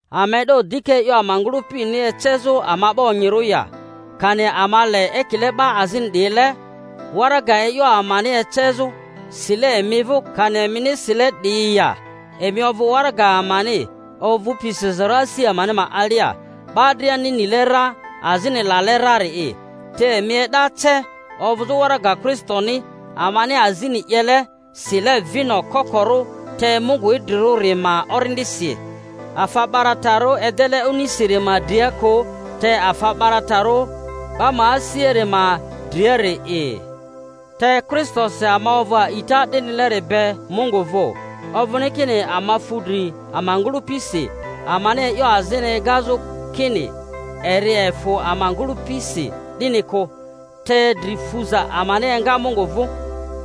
Ama e'do dika e'yo ama ngᴜlᴜpini ecezᴜ ama 'ba onyirᴜ ya? Kani ama le, ekile 'ba azini 'diyile, waraga e'yo amani ecezᴜ, sile emi vᴜ, kani emini sile 'diyi ya? Emi ovᴜ waraga amani, ovᴜpi sizarᴜ asi amani alia, 'ba driani nile ra azini lale rari'i; te emi e'da ce ovᴜzᴜ waraga Kristoni, amani azini 'yele, sile vino kokorᴜ te Mungu idrirᴜri ma Orindisi, afa 'baratarᴜ edele onisiri ma dria kᴜ, te afa 'baratarᴜ 'ba ma asiari ma driari'i. Te Kristosi ama ovᴜ a'ita 'dinileri be Mungu vᴜ. Ovᴜni kini ama fu dri ama ngᴜlᴜpisi, amani e'yo azini egazᴜ kini eri efᴜ ama ngᴜlᴜpisi, 'dini kᴜ, te dri fuza amani enga Mungu vᴜ;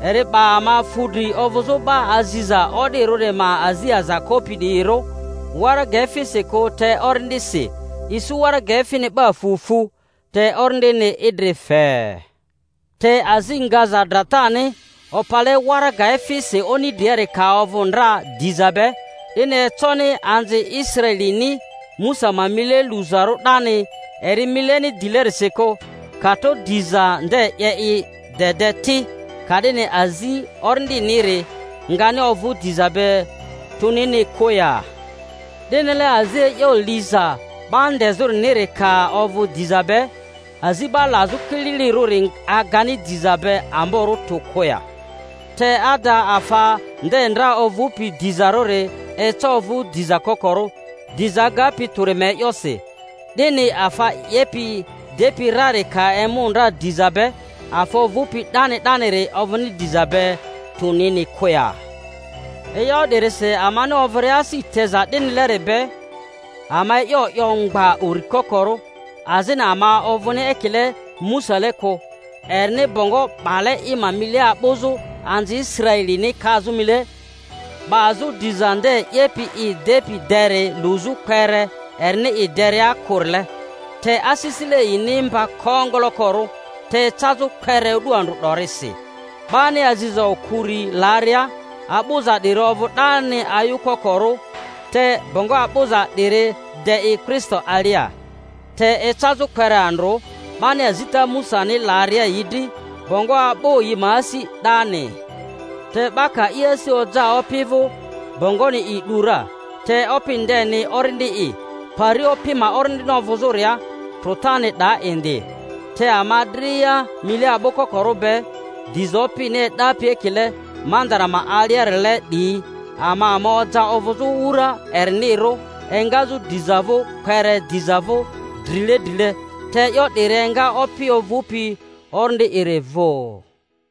eri 'ba ama fudri ovᴜzᴜ 'ba aziza o'dirᴜri ma azi aza kopi 'diyirᴜ, waraga efisi kᴜ te Orindisi; isu waraga efini 'ba fu fu, te Orindini idri fe. Te azi ngaza dratani, opale waraga efisi oni driari ka ovᴜ ndra diza be, 'dini econi anzi Israelini Musa ma mile luzarᴜ 'dani eri mileni dilerisi kᴜ, ka tro diza nde 'ye i de de ti, ka'dini azi Orindiniri ngani ovᴜ diza be tᴜnini kᴜ ya? 'Dinile azi e'yo liza 'ba ndezᴜriniri ka ovᴜ diza be, azi 'ba lazᴜ kililirᴜri agani diza be amborᴜ tᴜ kᴜ ya? Te ada, afa nde ndra ovᴜpi dizarᴜri eca ovᴜ diza kokorᴜ, diza agapi tᴜri ma e'yosi. 'Dini afa 'yepi i depi rari ka emu ndra diza be, afa ovᴜpi 'dani 'daniri ovᴜni diza be tᴜnini kᴜ ya? E'yo 'dirisi amani ovᴜria asi teza 'dinileri be, ama e'yo 'yo mgba uri kokorᴜ, azini ama ovᴜni ekile Musale kᴜ, erini bongo 'bale i mile a'bᴜzᴜ anzi Israelini kazᴜ mile 'bazᴜ diza nde 'yepi i depi deri luzᴜ kpere erini i deria kᴜrile. Te asisile yini mba kongolokorᴜ; te ecazᴜ kpere o'du andrᴜ 'dorisi, 'bani aziza okᴜri laria, a'bᴜza 'diri ovᴜ 'dani ayukokorᴜ, te bongo a'bᴜza 'diri de i Kristo alia. Te ecazᴜ kpere andrᴜ, 'bani azita Musani laria yi dri, bongo a'bᴜ yi ma asi 'dani; te 'ba ka i asi oja Opi vᴜ, bongoni i 'du ra. Te Opi ndeni Orindi'i, pari Opi ma Orindini ovᴜzᴜria, trᴜtani 'daa indi. Te ama dria, mile a'bᴜkokorᴜ be, diza Opini e'dapi ekile mandara ma alia-rile 'diyi, ama ama oja ovᴜzᴜ wura erinirᴜ, engazᴜ diza vᴜ kpere diza vᴜ drile drile; te e'yo 'diri enga Opi ovᴜpi Orindi'iri vᴜ.